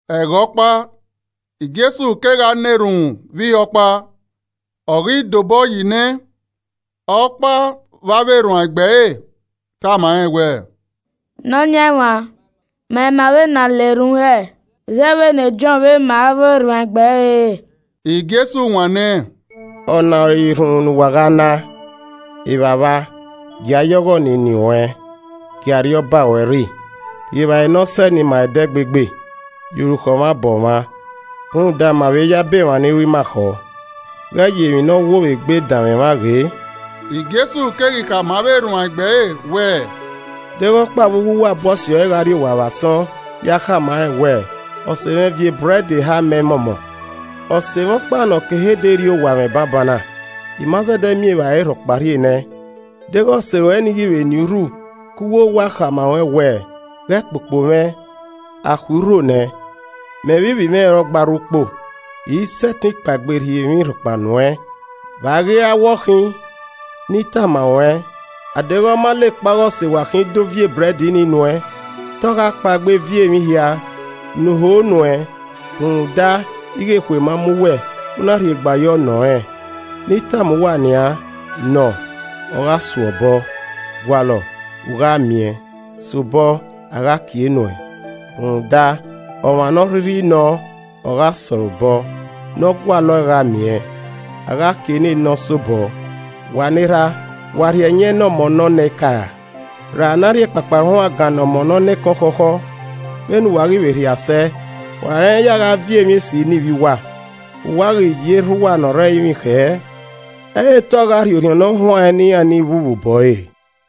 Ẹghẹ ọkpa, Jesu kegha na erhunmwu vbe ihe ọkpa. Ọ ghi dobọyi nẹ, ọkpa vbe avbe erhuanegbe ẹre tama rẹn wẹẹ, “Nọyaẹnmwa, ma ima vbene a na erhunmwu hẹ, zẹ vbene Jọn vbe ma avbe erhuanegbe ẹre re.” Jesu wanniẹn, “Ọna ọre erhunmwu ne uwa ghaa na: “ ‘Evbavba: Gia ya ọghọ ne eni ruẹn, gie Arriọba ruẹ rre. Rhie evbare ne ọ sẹe ne ima ẹdẹgbegbe, ye orukhọ mwa bọ mwa, rhunmwuda ma vbe yabọ emwa ni ru ima khọ. Ghẹ ye emwi ne ọ wo vbe egbe danmwẹ mwa ghe.’” Jesu keghi khama avbe erhuanegbe ẹre wẹẹ, “De ghẹ ọkpa vbe uwu uwa bu ọse ẹre gha rrie owa vbe asọn ya khama rẹn wẹẹ, ‘Ọse mwẹ viọ ebrẹd eha mẹ mọmọ. Ọse mwẹ ọkpa ne ọ ke ehe dee rrie owa mwẹ banbanna, I ma zẹdẹ miẹn evbare rhọkpa rhie nẹẹn.’ Deghẹ ọse ruẹ nii ghi vbe nien urhu ke uwowa khama ruẹn wẹẹ, ‘Ghẹ kpokpo mwẹ, a khui urho nẹ, mẹ vbe ivbi mwẹ ọre ogba rre ukpo, I i sẹtin kpaegbe rhie emwi rhọkpa miẹn.’ Vbe a ghi ra wẹ ọ khin? Ne I tama ruẹn, a deghẹ ọ ma la ekpa ọghe ọse wa khin kpaegbe do viọ ebrẹd nii nuẹn, te ọ gha kpaegbe viọ emwi hia ne u ho nuẹn rhunmwuda ighe ekhue ma mu uwẹ, u na rhiegba yọ nọ rẹn. Ne I tama uwa nian: Nọ, ogha su ẹe obọ, gualọ, u gha miẹn, so obọ, a gha kie nuẹn. Rhunmwuda ọmwa ne ọ rhirhi nọọn, ọ gha sẹ ọre obọ, ne ọ gualọe gha miẹn, a gha kie ne ne ọ sobọ. Wa ne erha, wa rhie ẹyẹn ne ọ ọmọ ne ọ nọ eka ra? Ra ne a rhie ekpakpahuangan ne ọmọ ne ọ nọ ekẹn ọkhọkhọ? Vbene uwa ghi vbe rhia sẹ, wa rẹn ya gha viọ emwi esi ne ivbi uwa. Vbe uwa ghi ye Erha uwa ne ọ rre ẹrinmwi khẹ, ẹ i re te ọ gha rhie Orhiọn Ne Ọ Huanrẹn ne iran hia ne ọ vbu vbe obọ ẹre!”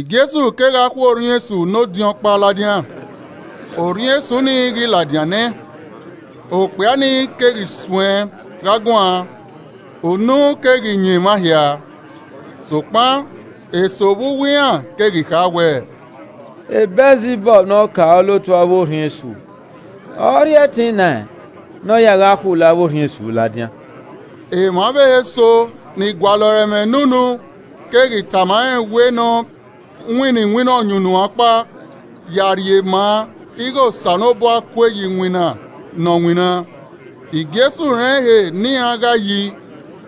Jesu kegha khu orhiọn esu ne odin ọkpa ladian, orhiọn esu ni ghi ladian nẹ, okpia ni keghi suẹn gha guan. Unu keghi yan emwa hia. Sokpan eso vbe uwu iran keghi kha wẹẹ, “Bẹlzibọb ne ọkaolotu avbe orhiọn esu ọre ọ rhie ẹtin nẹẹn ne ọ ya gha khulo avbe orhiọn esu ladian.” Emwa ọvbehe eso ni gualọ ẹre ẹmwẹ ne unu keghi tama rẹn wẹ ne ọ winna iwinna ọyunnuan ọkpa ya rhie maa ighe Osanobua kue ye iwinna ne ọ winna. Jesu rẹn ehe ne iran ghae yi,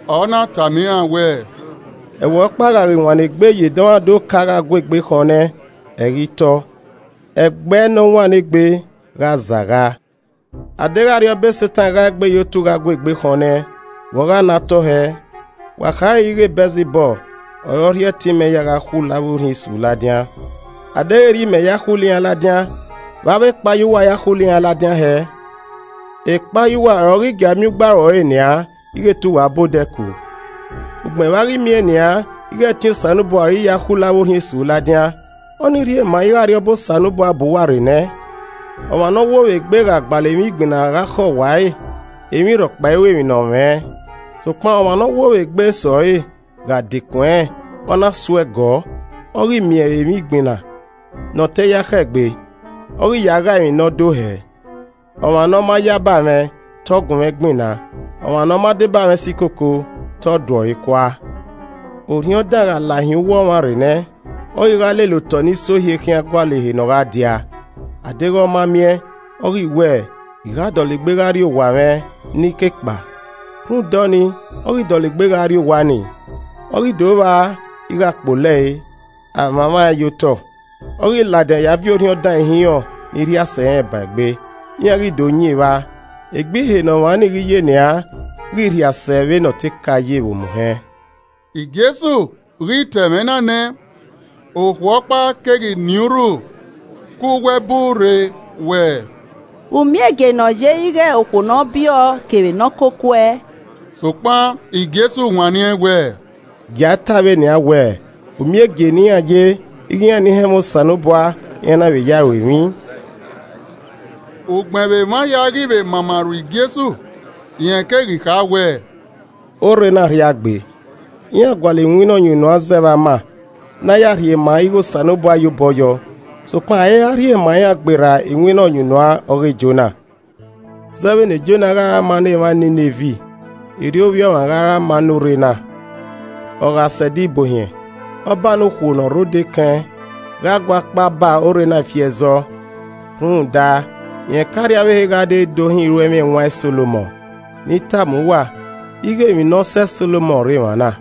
ọ na tama iran wẹẹ, “Ẹvbo ọkpa gha ghi wannọ egbe ye dọmwadẹ oka gha gu egbe khọn nẹ, ẹ i ghi tọ, ẹgbẹe ne ọ wannọ egbe, gha zagha. A deghẹ arriọba Setan gha egbe ye otu gha gu egbe khọn nẹ, vbe ọ gha na tọ hẹẹ? Wa khare ighe Bẹlzibọb ọre ọ rhie ẹtin mẹ ya gha khulo avbe orhiọn esu ladian. A deghẹ erriọ mẹ ya khulo iran ladian, vbe avbe ekpayẹ uwa ya khulo iran ladian hẹẹ? Ekpayẹ uwa ọre ọ ghi gia miẹn ugbaro ẹre nian ighe te uwa ba odẹ ku. Ugbẹn vbe a ghi miẹn nian ighe ẹtin Osanobua ọre I ya khulo avbe orhiọn esu ladian, ọnii rhie maa ighe Arriọba Osanobua hu uwa rre nẹ. “Ọmwa ne ọ wo vbe egbe gha gbalọ emwi igbinna gha khẹ owa ẹre, emwi rhọkpa i ru emwi ne ọ mwẹ. Sokpan ọmwa ne ọ wo vbe egbe sẹ ọre gha dekun ẹnrẹn, ọ na so ẹe gọọ, ọ ghi miẹn re emwi igbinna ne ọ te ya khẹ egbe, ọ ghi ya ghae emwi ne ọ do hẹẹ. “Ọmwa ne ọ ma yaba mwẹ, te ọ gun mwẹ gbinna, ọmwa ne ọ ma deba mwẹ si koko, te ọ du ẹe ọre kua. “Orhiọn dan gha lahin uwu ọmwa rre nẹ, ọ ghi gha lele otọe ni sohie khian gualọ ehe ne ọ gha dia, adeghẹ ọ ma miẹn, ọ ghi wẹẹ, ‘I gha dọlegbe gha rrie owa mwẹ ne I ke kpao!’ Rhunmwuda ọnii, ọ ghi dọlegbe gha rrie owa nii, ọ ghi do vba ighe a kpolo ẹe, a mwamwa ẹn ye otọ. Ọ ghi ladian ya viọ orhiọn dan ihinrọn ni rhia sẹ irẹn ba egbe, iran ghi do yin evba. Egbe ihe ne ọmwa ni ghi ye nian ghi rhia sẹ vbe ne ọ te ka ye vbe omuhẹn.” Jesu ghi ta ẹmwẹ na nẹ, okhuo ọkpa keghi niẹn urhu ke uwu ẹbu rre wẹẹ, “U miẹn egie ne ọ ye ighe okhuo nẹ ọ biẹ ọ kevbe ne ọ koko uẹ!” Sokpan Jesu wanniẹn wẹẹ, “Gie ta ẹe vbe nian wẹẹ, umiẹn egie ne iran ye ighe iran ni họn ẹmwẹ Osanobua iran na vbe ya ẹe ru emwi.” Ugbẹn vbe emwa hia ghi vbe mama rhu Jesu, rẹn keghi kha wẹẹ, “Orre na rhia gbe. Iran gualọ iwinna ọyunnuan zẹ vbe ama ne a ya rhie maa ighe Osanobua ya obọ yọ. Sokpan a i ra rhie maa iran gberra iwinna ọyunnuan ọghe Jona. Zẹ vbene Jona gha re ama ne emwa Ninevi, erriọ Ovbi Ọmwa ra gha re ama ne orre na. Ọ gha sẹ Ẹdẹ Ibuohiẹn, Ọba ne okhuo ne ọ rre odẹ ekẹn, gha guakpao ba orre na ifi ẹzọ rhunmwuda rẹn ke arriavbehe gha dee do họn iruẹmwi ẹwaẹn Solomọn. Ne I tama uwa ighẹ emwi ne ọ sẹ Solomọn rre emwa na.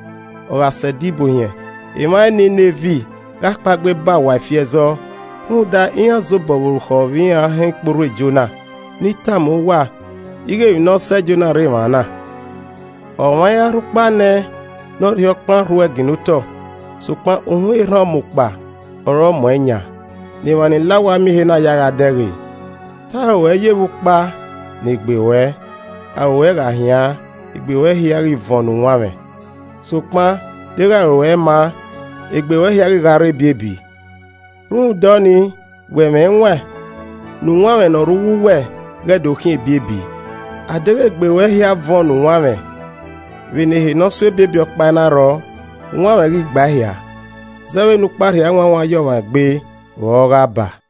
Ọ gha sẹ Ẹdẹ Ibuohiẹn, emwa Ninevi gha kpaegbe ba uwa ifi ẹzọ, rhunmwuda iran zobọ vbe orukhọ vbe iran họn ikporhu e Jona, ne I tama uwa ighẹ emwi ne ọ sẹ Jona rre emwa na. “Ọmwa i ra rhukpa nẹ ne ọ rhie okpan rhuẹe ginna otọ, sokpan uhunmwu erhan ọmukpa ọre ọ mu ẹn yan, ne emwa ni la owa miẹn ehe na ya ẹe gha dẹghe. Te aro ruẹ yevbe ukpa ne egbe ruẹ. Aro ruẹ gha hian, egbe ruẹ hia ghi vuọn ne uwanmwẹ, sokpan deghẹ aro ruẹ ẹi ma an, egbe ruẹ hia ghi gha rre ebiebi. Rhunmwuda ọnii, wẹ mwẹ ẹwaẹn ne uwanmwẹ ne ọ rre uwu uwa ghẹ do khian ebiebi. A deghẹ egbe ruẹ hia vuọn ne uwanmwẹ, vbene ehe ne ọ so ebiebi ọkpa i na rrọọ, uwanmwẹ ghi gba ehia, zẹ vbene ukpa rhie awanwan ye ọmwa egbe vbe ọ a gha baa.”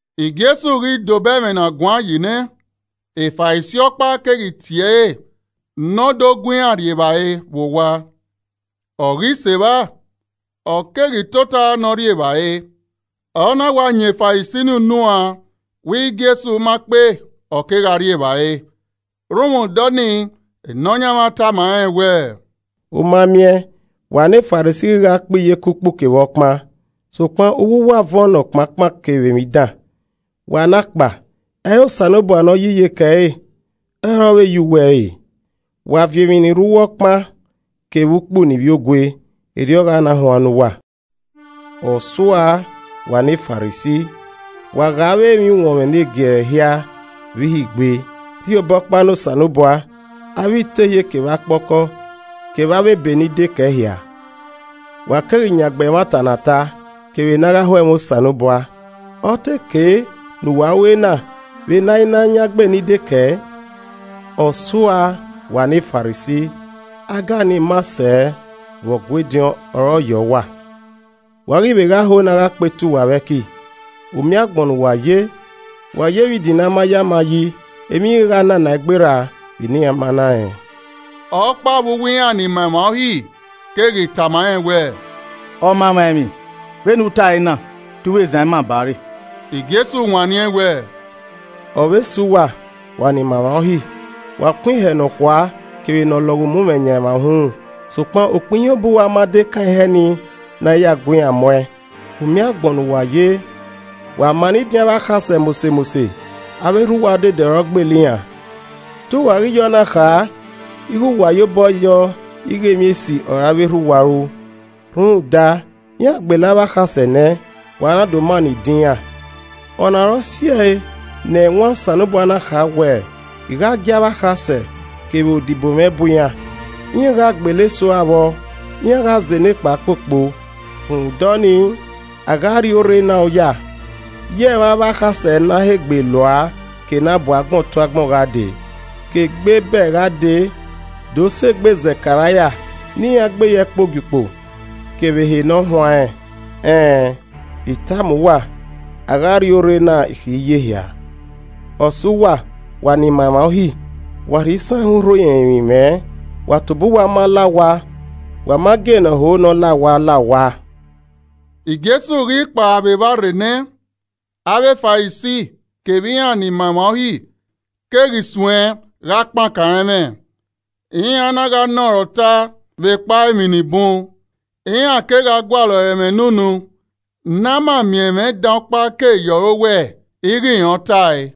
Jesu ghi dobọ ẹmwẹ ne a guan yi nẹ, e Farisi ọkpa keghi tie ẹre ne ọ do gu iran rrie evbare vbe owa. Ọ ghi sẹ evba, ọ keghi tota ne ọ rri evbare. Ọ na wa yan e Farisi ni unuan wẹ Jesu ma kpe ọ kegha rri evbare. Rhunmwuda ọnii Nọyaẹnmwa tama rẹn wẹẹ, “U ma miẹn, wa ne Farisi ghi gha kpe iyeke ukpu kevbe ọkpa, sokpan uwu uwa vuọn ne ọkpankpan kevbe emwi dan. Wa ne akpa! Ẹ i re Osanobua ne ọ yi iyeke ẹre ọ re ọ vbe yi uwu ẹre. Wa viọ emwi ni rre uwu ọkpan kevbe ukpu ne uwa mwẹ ne ivbiogue, erriọ ọ gha na huan ne uwa. “Ọ suaa, wa ne Farisi! Wa ghae avbe emwi uwọnmwẹ negiẹrẹ hia vbe ihe igbe, rhie obọkpa ne Osanobua, avbe itehie kevbe akpọkọ kevbe avbe ebe ni dekẹe hia, wa keghi yangbe ẹmwata ne a ta, kevbe ne a gha ho ẹmwẹ Osanobua. Ọ te kei ne uwa ru ena vbe ne a i na yangbe ni dekẹe. “Ọ suaa, wa ne Farisi, Aga ni maa sẹ vbe Ọgua ediọn, ọre ọ yẹ uwa. Wa ghi vbe gha ho ne a gha kpee tuẹ uwa vbe ẹki. Umiẹn agbọn ne uwa ye! Wa yevbe idin ne a ma ye ama yi, emwi ghi gha nanaẹn gberra vbene iran ma na rẹn.” Ọkpa vbe uwu iran ni ma emwa Uhi keghi tama rẹn wẹẹ, “Ọmamwaemwi, vbe ne u tae na, te u vbe zan ima ba ẹre!” Jesu wanniẹn wẹẹ, “Ọ vbe sẹ uwa, wa ni ma emwa Uhi, wa kun ihẹ ne ọ khua, kevbe ne ọ lọghọ umumwẹ yan emwa uhunmwu, sokpan ukpẹ ihiẹn obọ uwa ma dekan ihẹ ni ne a ya gu iran mu ẹn. U miẹn agbọn ye uwa ye! Wa mannọ idin avbe akhasẹ mose mose, avbe erha uwa odede ọre ọ gbele iran. Te uwa ghi ye ọ na kha ighẹ wa yobọ yọ ighẹ emwi esi ọre avbe erha uwa ru, rhunmwuda, iran gbele avbe akhasẹ nẹ, wa na do mannọ idin iran. Ọ na ọre ọ si ẹe ne Ẹwaẹn Osanobua na kha wẹ, ‘I gha gie avbe akhasẹ, kevbe odibo mwẹ bu iran, iran gha gbele eso ua vbọ, iran gha zẹ nekpa kpokpo.’ Rhunmwuda ọnii, a gha rri orre na oya ye ẹmwẹ avbe akhasẹ ne a he gbele ua ke ne a bu agbọn tu agbọn gha dee. Ke egbe Ebel gha dee do sẹ egbe Zẹkaraia ne iran gbe ye ẹkpo Ogiukpo kevbe ehe ne ọ huanrẹn. Ẹn ẹn, I tama uwa a gha rria orre na ikhi ye ehia. “Ọ sẹ uwa, wa ni ma emwa Uhi! Wa rhie isanhẹn urho irẹnmwi mwẹ, wa tobọ uwa ma la owa, wa ma gie ne ọ ho ne ọ la owa, la owa.” Jesu ghi kpao vbe evba re nẹ, avbe Farisi kevbe iran ni ma emwa Uhi keghi suẹn gha kpankan ẹre ẹmwẹ, iran na gha nọ ẹre ọta vbekpa emwi ni bun. Iran kegha gualọ ọre ẹmwẹ ne unu ne a ma miẹn ẹmwẹ dan ọkpa ke ye ọre owẹ ighẹ rẹn ọre ọ tae.